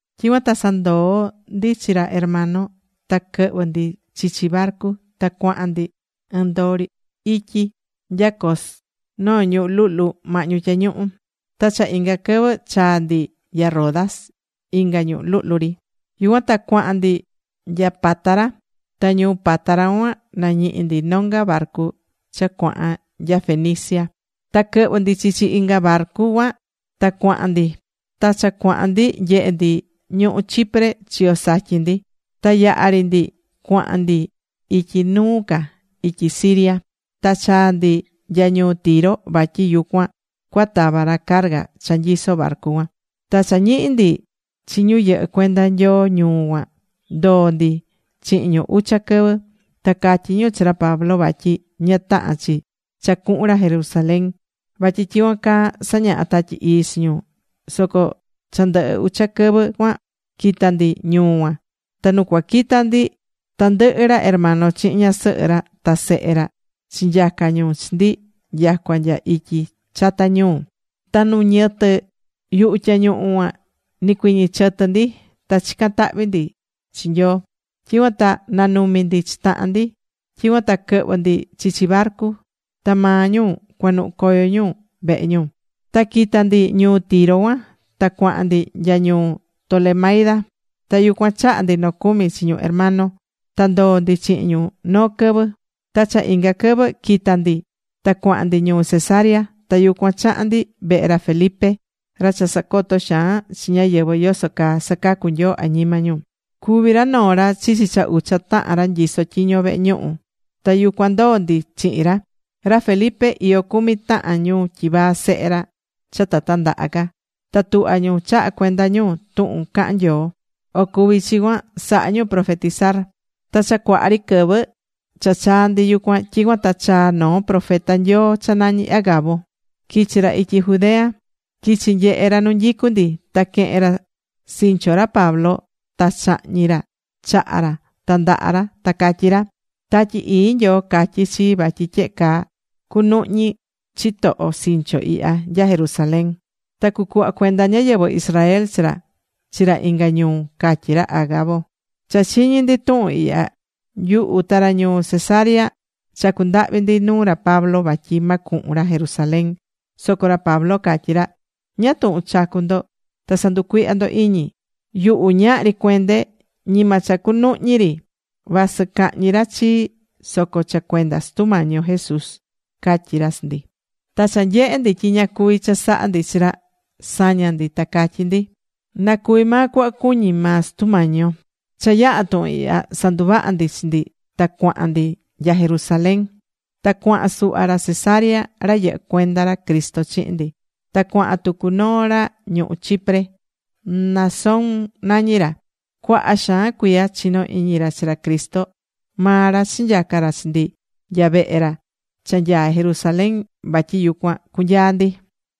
Tyicuan ta sandoo̱ ndi chi ra hermano ta quɨhvɨ̱ ndi chichi barcu. Ta cuaha̱n ndi ɨɨn ndoo ityi ri nya Cos noo ñuhú luhlu mahñu tyañuhu. Ta cha inga quɨvɨ chaa̱ ndi nya Rodas inga ñuhú luhlu ri. Yucuan ta cuahan ndi nya Pátara. Ta ñuu Pátara cuan nañihi̱ ndi nonga barcu cha cuahan nya Fenicia. Ta quɨhvɨ̱ ndi chichi inga barcu cuan ta cuaha̱n ndi. Ta cha cuahan ndi nyehe ndi ñuhú Chipre chiyo satyin ndi. Ta yaha̱ ri ndi cuahan ndi ityi nu ca, ityi Siria. Ta chaa̱ ndi nya ñuu Tiro vatyi yucuan cuatava ra carga cha nyisó barcu cuan. Ta cha nañihi̱ ndi chi ñu yɨhɨ́ cuenda Nyoo ñuu cuan, ndoo̱ ndi chihin ñu ucha quɨvɨ. Ta catyí ñu chi ra Pablo vatyi ña tahán chi cha cuhun ra Jerusalén vatyi tyicuan caa sañaha̱ Tatyi Ii chi ñu. Soco cha ndɨhɨ ucha quɨvɨ cuan quita̱ ndi ñuu cuan. Ta nu cuaquita ndi tandɨhɨ ra hermano chihin ñasɨhɨ ra ta sehe ra chinyaca̱ ñu chi ndi nyacua nya ityi chata ñuu. Ta nu ñɨtɨ yuhu tyañuhu cuan nicuiñi̱ chɨtɨ ndi, ta chicán tahvi ndi chi Nyoo. Tyicuan ta nanumi ndi chi tahan ndi. Tyicuan ta quɨhvɨ̱ ndi chichi barcu. Ta maa ñu cuanuhu̱ coyo ñu vehe ñu. Ta quita̱ ndi ñuu Tiro cuan ta cuahan ndi nya ñuu Tolemaida. Ta yucuan chaha̱ ndi nocumi chi ñu hermano. Ta ndoo̱ ndi chihin ñu noo quɨvɨ. Ta cha inga quɨvɨ quita̱ ndi ta cuahan ndi ñuu Cesarea. Ta yucuan chaha̱n ndi vehe ra Felipe ra cha sacotó xaan chi ñáyɨvɨ yoso caa sacacu Nyoo añima ñu. Cuví ra noo ra chichi cha ucha tahan ra nyisó tyiño vehe ñuhu. Ta yucuan ndoo̱ ndi chihin ra. Ra Felipe, iyó cumi tahan ñu tyivaa sehe ra cha ta tandaha ca. Ta tuhvá ñu chahá cuenda ñu tuhun cahán Nyoo. O cuvi chi cuan sahá ñu profetizar. Ta cha cuaha ri quɨvɨ cha chaa̱ ndi yucuan, tyicuan ta chaa̱ noo profeta Nyoo cha nañí Agabo. Quichi̱ ra ityi Judea. Quichi̱ nyehe̱ ra nu nyicu ndi. Ta quehe̱n ra sincho ra Pablo, ta cháhñi̱ ra chaha ra ta ndaha ra, ta catyí ra: ―Tatyi Ii Nyoo catyí chii vatyi tyehe caa cunuhñi chitoho sincho ihya nya Jerusalén. Ta cucuhva cuenda ñáyɨvɨ Israel chi ra chi ra inga ñuu ―catyí ra Agabo. Cha chiñi̱ ndi tuhun ihya, nyuhu ta ra ñuu Cesarea chacú ndahvi ndi nuu ra Pablo vatyi ma cuhun ra Jerusalén. Soco ra Pablo catyí ra: ―¿Ñáá tuhun chacú ndo ta sanducuihyá ndo iñi? Yuhu ñahri cuende. Ñima cha cunuhñi ri, vasɨ cahñi ra chii soco cha cuenda Sutu Mañi yo Jesús ―catyí ra chi ndi. Ta cha nyehe̱ ndi tyi ña cuvi̱ chasaha ndi chi ra, saña̱ ndi. Ta catyí ndi: ―Na cuvi maa cuhva cuñí maa Sutu Mañi yo. Cha yaha̱ tuhun ihya sanduvaha̱ ndi chi ndi ta cuahan ndi nya Jerusalén. Ta cuahan suhva ra Cesarea ra yɨhɨ́ cuenda ra Cristo chihin ndi. Ta cuahan tucu noo ra ñuhú Chipre. Mnasón nañí ra. Cuaha xaan cuiya chinó iñi ra chi ra Cristo. Maa ra chinyaca̱ ra chi ndi nya vehe ra cha nyaá Jerusalén vatyi yucuan cunyaa ndi.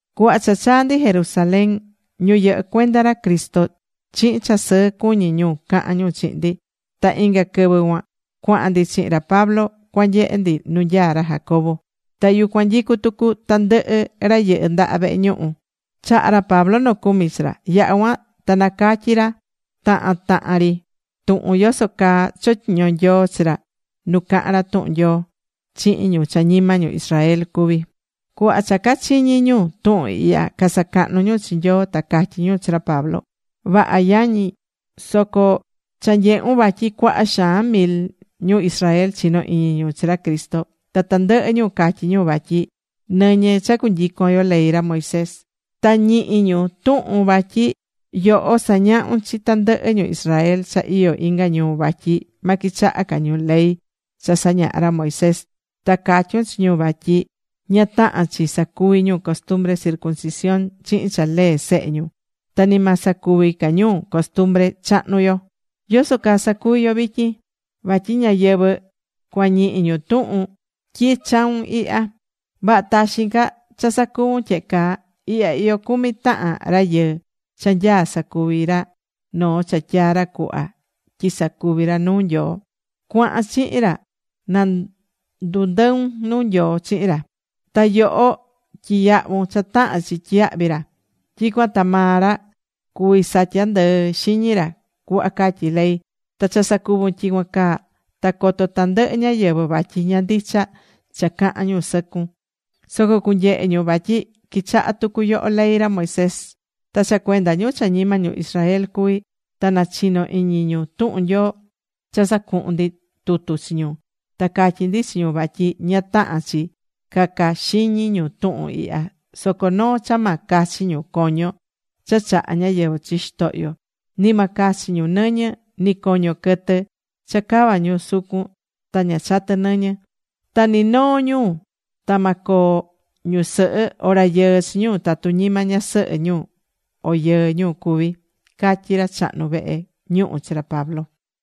Cuhva cha chaa̱ ndi Jerusalén, ñu yɨhɨ́ cuenda ra Cristo chihin cha sɨɨ cuñí ñu cahán ñu chihin ndi. Ta inga quɨvɨ cuan cuahan ndi chihin ra Pablo cuanyehe ndi nu nyaá ra Jacobo. Ta yucuan nyicú tucu tandɨhɨ ra yɨhɨ́ ndaha vehe ñuhu. Chaha̱ ra Pablo nocumi chi ra. Yaha̱ cuan ta nacatyi̱ ra tahan tahan ri tuhun yoso caa chotyiño̱ Nyoo chi ra nu cahan ra tuhun Nyoo chihin ñu cha ñima ñu Israel cuví. Cuhva cha cachiñi̱ ñu tuhun ihya, casacahnu ñu chi Nyoo, ta catyí ñu chi ra Pablo: ―Vaha yañi yo, soco cha nyehun vatyi cuaha xaan mil ñu Israel chinó iñi ñu chi ra Cristo. Ta tandɨhɨ ñu catyí ñu vatyi nɨñɨ cha cunyicon yo ley ra Moisés. Ta ñihí ñu tuhun vatyi yoho sañahún chi tandɨhɨ ñu Israel cha iyó inga ñuu vatyi ma quichaha ca ñu ley cha sañaha̱ ra Moisés, ta catyún chi ñu vatyi ña tahán chi sacuví ñu costumbre circuncisión chihin cha lee sehe ñu, ta ni ma sacuvi ca ñu costumbre chahnu yo. ¿Yoso caa sacuvi yo vityin? Vatyi ñáyɨvɨ cuañihi ñu tuhun tyi chau̱n ihya. Vaha taxin ca cha sacuvun tyehe caa. Ihya iyó cumi tahan rayɨɨ cha nyaá sacuvi ra noo cha tyaa̱ ra cuhva tyi sacuvi ra nuu Nyoo. Cua̱han chihin ra na ndundɨun nuu Nyoo chihin ra. Ta yoho tyi̱yahvun cha tahán chi tyiyahvi ra. Tyicuan ta maa ra cuvi satya ndɨɨ xiñi ra cuhva catyí ley. Ta cha sacuvun tyicuan caa ta coto tandɨhɨ ñáyɨvɨ vatyi ña ndicha cha cahán ñu sɨcun, soco cunyehe ñu vatyi quichahá tucu yoho ley ra Moisés. Ta cha cuenda ñu cha ñima ñu Israel cuví, ta nachinó iñi ñu tuhun Nyoo, cha sacuhu̱n ndi tutu chi ñu, ta catyi̱ ndi chi ñu vatyi ña tahán chi caca xiñi ñu tuhun ihya. Soco noo cha ma cachi ñu coño cha chahá ñáyɨvɨ chi xitohyo. Ni ma cachi ñu nɨñɨ ni coño quɨtɨ cha cava ñu sucun ta ña chatɨ nɨñɨ. Ta ni noo ñu ta ma coo ñusɨhɨ o rayɨɨ chi ñu tatu ñima ñasɨhɨ o yɨɨ ñu cuví ―catyí ra chahnu vehe ñuhu chi ra Pablo.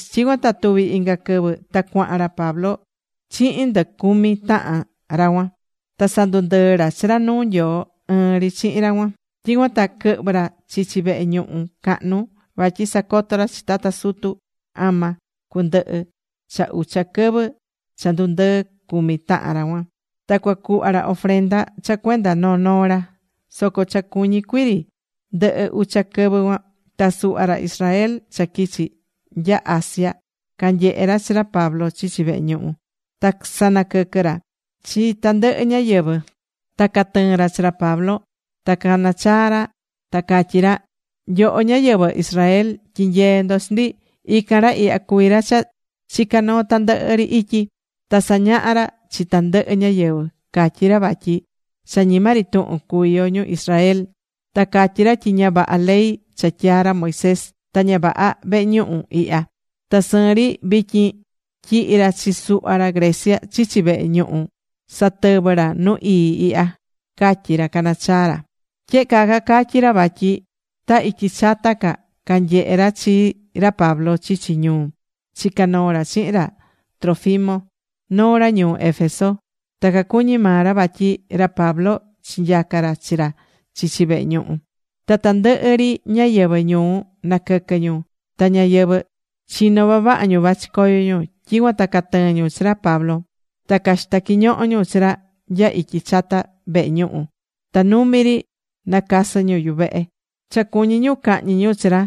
Tyicuan ta tuvi̱ inga quɨvɨ ta cuahan ra Pablo chihin ndɨ cumi tahan ra cuan. Ta sandundɨɨ̱ ra chi ra nuu Nyoo ɨɨn ri chihin ra cuan. Tyicuan ta quɨhvɨ̱ ra chichi vehe ñuhu cahnu vatyi sacoto ra chi tata sutu ama cundɨhɨ cha ucha quɨvɨ cha ndundɨɨ ndɨ cumi tahan ra cuan, ta cuacuhva ra ofrenda cha cuenda noo noo ra. Soco cha cuñí cuii ri ndɨhɨ ucha quɨvɨ cuan, ta suhva ra Israel cha quichi̱ nya Asia canyehe̱ ra chi ra Pablo chichi vehe ñuhu. Ta casanaquɨquɨ̱ ra chi tandɨhɨ ñáyɨvɨ, ta catɨɨ̱n ra chi ra Pablo. Ta cacanachaá ra ta cacatyí ra: ―Nyoho ñáyɨvɨ Israel, tyi̱nyee ndo chi ndi. Ican ra ihya cuví ra cha chicá noo tandɨhɨ ri ityi. Ta sañahá ra chi tandɨhɨ ñáyɨvɨ. Catyí ra vatyi cha ñima ri tuhun cuví yo ñu Israel. Ta catyí ra tyi ña vaha ley cha tyaa̱ ra Moisés, ta ña vaha vehe ñuhu ihya. Ta sɨɨn ri vityin tyihi̱ ra chi suhva ra Grecia chichi vehe ñuhu satɨvɨ́ ra nu ii ihya ―catyí ra canachaá ra. Tyehe caa cacatyi̱ ra vatyi ta ityi chata ca canyehe̱ ra chi ra Pablo chichi ñuu, chicá noo ra chihin ra Trófimo, noo ra ñuu Éfeso. Ta cacuñí maa ra vatyi ra Pablo chinyaca̱ chi ra chichi vehe ñuhu. Ta tandɨhɨ ri ñáyɨvɨ ñuu naquɨquɨ́ ñu. Ta ñáyɨvɨ chinó vavaha ñu vachi coyo ñu. Tyicuan ta catɨɨ̱n ñu chi ra Pablo. Ta caxita̱ quiñoho ñu chi ra nya ityi chata vehe ñuhu, ta numi ri nacasɨ ñu yuvehe. Cha cuñí ñu cahñi ñu chi ra,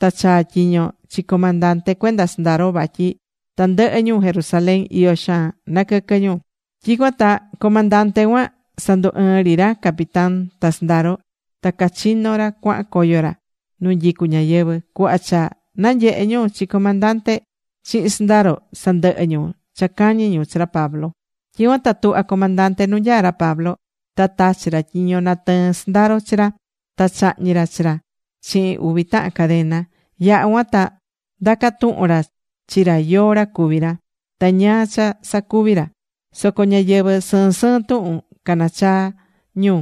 ta chaa̱ tyiño chi comandante cuenda sɨndaro vatyi tandɨhɨ ñu Jerusalén iyó xaan naquɨquɨ́. Tyicuan ta comandante cuan sandu ɨɨ̱n ri ra capitán ta sɨndaro. Ta cachino̱ ra cuahan coyo ra nu nyicú ñáyɨvɨ. Cuhva cha nanyehe̱ ñu chi comandante chihin sɨndaro, sandɨhɨ̱ ñu cha cañí ñu chi ra Pablo. Tyicuan ta tuhva̱ comandante nu nyaá ra Pablo. Ta tachi̱ ra tyiño natɨɨn sɨndaro chi ra, ta cháhñi̱ ra chi ra chihin uvi tahan cadena. Yaha̱ cuan ta ndaca̱ tuhun ra chi ra yóó ra cuví ra, ta ñáá cha sacuvi̱ ra. Soco ñáyɨvɨ sɨɨn sɨɨn tuhun canachaá ñu.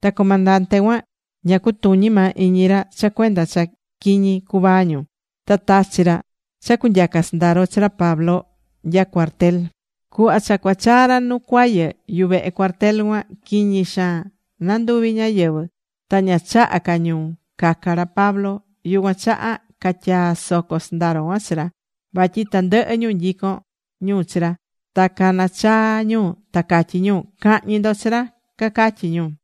Ta comandante cuan ña cutuñí maa iñi ra cha cuenda cha quiñi cuvaa ñu. Ta tachi̱ ra cha cunyaca sɨndaro chi ra Pablo nya cuartel. Cuhva cha cachaá ra nu cuayɨ yuvehe cuartel cuan, quiñi xaan nanduví ñáyɨvɨ ta ña chahá ca ñu caca ra Pablo. Yucuan chaha catyaa̱ soco sɨndaro cuan chi ra. Vatyi tandɨhɨ ñu nyicón ñu chi ra, ta canachaá ñu ta catyí ñu: ―¡Ca̱hñi ndo chi ra! ―cacatyi ñu.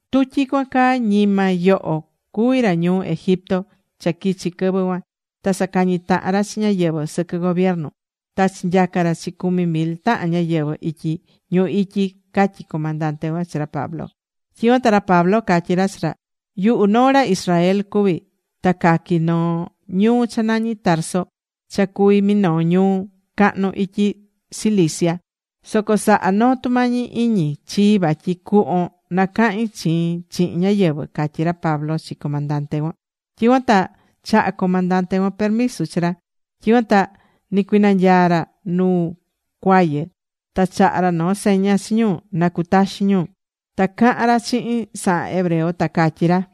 Tu tyicuan caa, ñima yoho cuví ra ñuu Egipto cha quichi̱ quɨvɨ cuan ta sacañi tahan ra chi ñáyɨvɨ sɨquɨ gobiernu ta chinyaca̱ ra chi cumi mil tahan ñáyɨvɨ ityi ñuhu ityi ―catyí comandante cuan chi ra Pablo. Tyicuan ta ra Pablo catyí ra chi ra: ―Yuhu noo ra Israel cuví ta caqui̱ noo ñuu cha nañí Tarso cha cuví minoo ñuu cahnu ityi Cilicia. Soco sa̱ha noo tumañi iñi chii vatyi cuhvon nacahin chiin chihin ñáyɨvɨ ―catyí ra Pablo chi comandante cuan. Tyicuan ta chaha̱ comandante cuan permiso chi ra. Tyicuan ta nicuinanyaa̱ ra nu cuayɨ ta chaha̱ ra noo seña chi ñu na cutaxin ñu. Ta cahán ra chihin sahan hebreo, ta catyí ra: